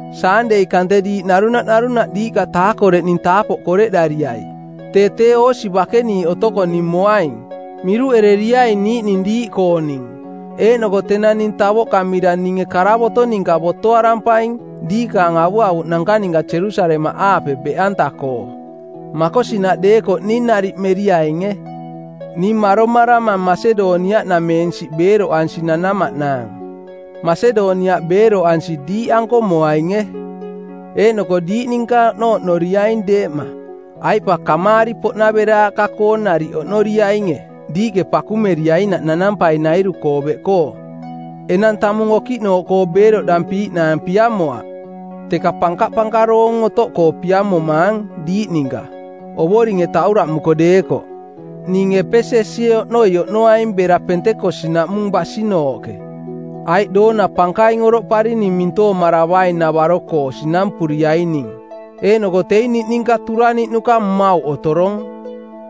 Saandei kante diiꞌ narunaꞌ narunaꞌ diiꞌka taakoreꞌning taapoꞌ koreꞌdariai. Tee tee oosi bakeniiꞌ otoko ning moaing. Miruꞌereriaing niiꞌning diiꞌkooning, eeꞌnoko tenang ning tavoꞌkamira ninge karavoto˜ ninka botoarampaing diikaang avuavuꞌnanka ninka Jerusalemaꞌaape beꞌanta-koo. Makosinaꞌ deekoꞌ ning nariꞌ meriainge. Ning maromaramang Masedoniaꞌnameensiꞌ beeroꞌansi nanamaꞌnaang. Masedoniaꞌ beeroꞌansi diiꞌanko moainge. Eeꞌnoko diiꞌ ninka oꞌnooꞌnoriaing deeꞌma, aiꞌ pa kamaari-poꞌnaveraaꞌka-koo nariꞌ oꞌnoriainge diiꞌke pakumeriainaꞌ nanampainairu-koo beꞌkoo. Enang tamung okiꞌnooꞌkoo beeroꞌdampiiꞌnaang piamoaꞌ, teka pankapankaroong otoꞌkoo piamomaang diiꞌ ninka, Ovoringe tauraꞌmuko deekoꞌ. Ning Epesesie oꞌnoi oꞌnoaing bera Pentekos-naꞌmung basinooꞌke. Aiꞌ doona pankaing oroꞌparing ning mintoomaravaing-navaro-koo sinampuriaining. Eeꞌnoko teing niꞌninka turaniꞌnuka mmauꞌ otorong.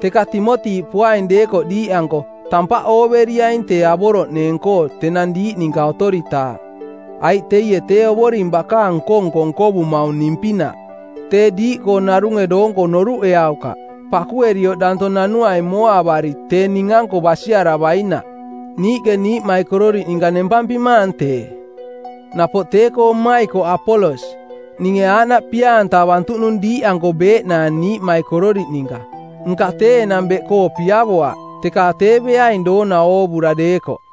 Teka Timoti poaing deekoꞌ diiꞌanko, tampaꞌ ooveriaing tee avoroꞌneeng-koo tenang diiꞌ ninka otoritaaꞌ, aiꞌ teie tee Ovoring bakaang nko-nko nkovumaung ning-pinaꞌ. Tee diiꞌkoo narunge doonko noruꞌeaukaꞌ. Pakuerioꞌ danto nanuaing mooavari tee ning-anko basiaravainaꞌ. Niiꞌke niiꞌmaikororiꞌ ninka nempampimaang tee. Napoꞌ tee-koo mmaikoꞌ Apolos: Ninge aaꞌnaꞌ pia-antavantuꞌnung diiꞌanko beeꞌnaang niiꞌmaikororiꞌ ninka, nka tee enang beꞌkoo piavoaꞌ, teka tee beaing doona oovura deekoꞌ.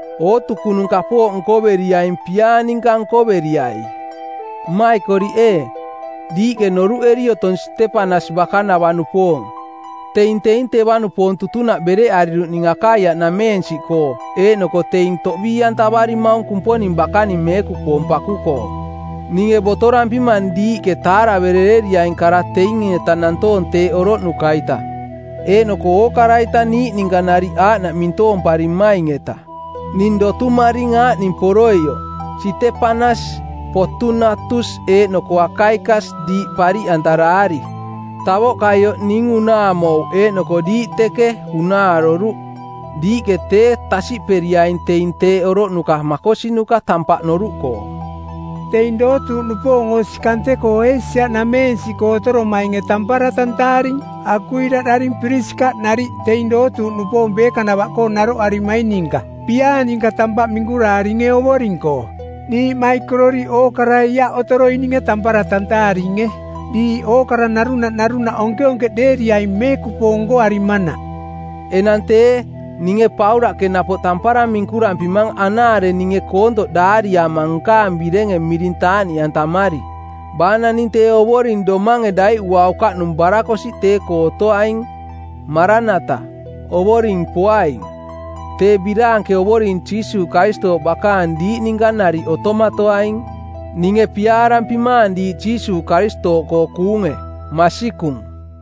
Ootukunung kapooꞌ nkoveriaing piaa ninka nkoveriai. Mmaikoriꞌ ee, diiꞌke noruꞌeri otong Sitepanas bakanava-nupoong teing teing teva-nupoong tutunaꞌ bereꞌariruꞌning Akaiaꞌnameensiꞌkoo eeꞌnoko teing toꞌbii-antavarimaung Kumponing bakaning meekupoong paku-koo. Ninge botorampimang diiꞌke taaraveriaing kara teing-eta nantoong teeꞌ oroꞌnuka-ita, eeꞌnoko ookara-ita niiꞌ ninka nariꞌ aaꞌnaꞌ mintoompariaining-eta. Ning dotumaring aaꞌning poroioꞌ: Sitepanas, Potunatus eeꞌnoko Akaikas diiꞌ pariꞌantaraari. Tavoꞌkaioꞌ ning unaamouꞌ eeꞌnoko diiꞌ teeꞌke, unaaroruꞌ. Diiꞌke tee tasiꞌperiaing teing teeꞌ oroꞌnuka makosinuka tampaꞌ noruꞌkoo. Teing dootuuꞌnupoong osi kante-koo Eesia-nameensiꞌkoo otoromainge tampara tantaaring. Akuila daring Pirisikaꞌ nariꞌ teing dootuuꞌnupoong beekanava-koo naroꞌarimaing ninka piaa ninka tampaꞌ minkuraaringe Ovoring-koo. Niiꞌmaikororiꞌ ookarai aaꞌ otoroininge tampara tantaaringe. Diiꞌ ookara narunaꞌ narunaꞌ onkeonkeꞌdeeriaing meekupoong nkoarimanaꞌ. Enang tee, ninge Paulaꞌke napoꞌ tampara minkurampimang anaare ninge koontoꞌ daariama nkaang birenge miring taaꞌniꞌantamari. Baa naning tee Ovoring domange daiꞌuaukaꞌnung barakosiꞌ tee-koo otoaing. “Maranata” – Ovoring poaing. Tee biraanke Ovoring Jiisuuꞌ Karistooꞌ bakaang diiꞌ ninka nariꞌ otomatoaing. Ninge piaarampimaang diiꞌ Jiisuuꞌ Karistooꞌkoo kuunge. Masikung.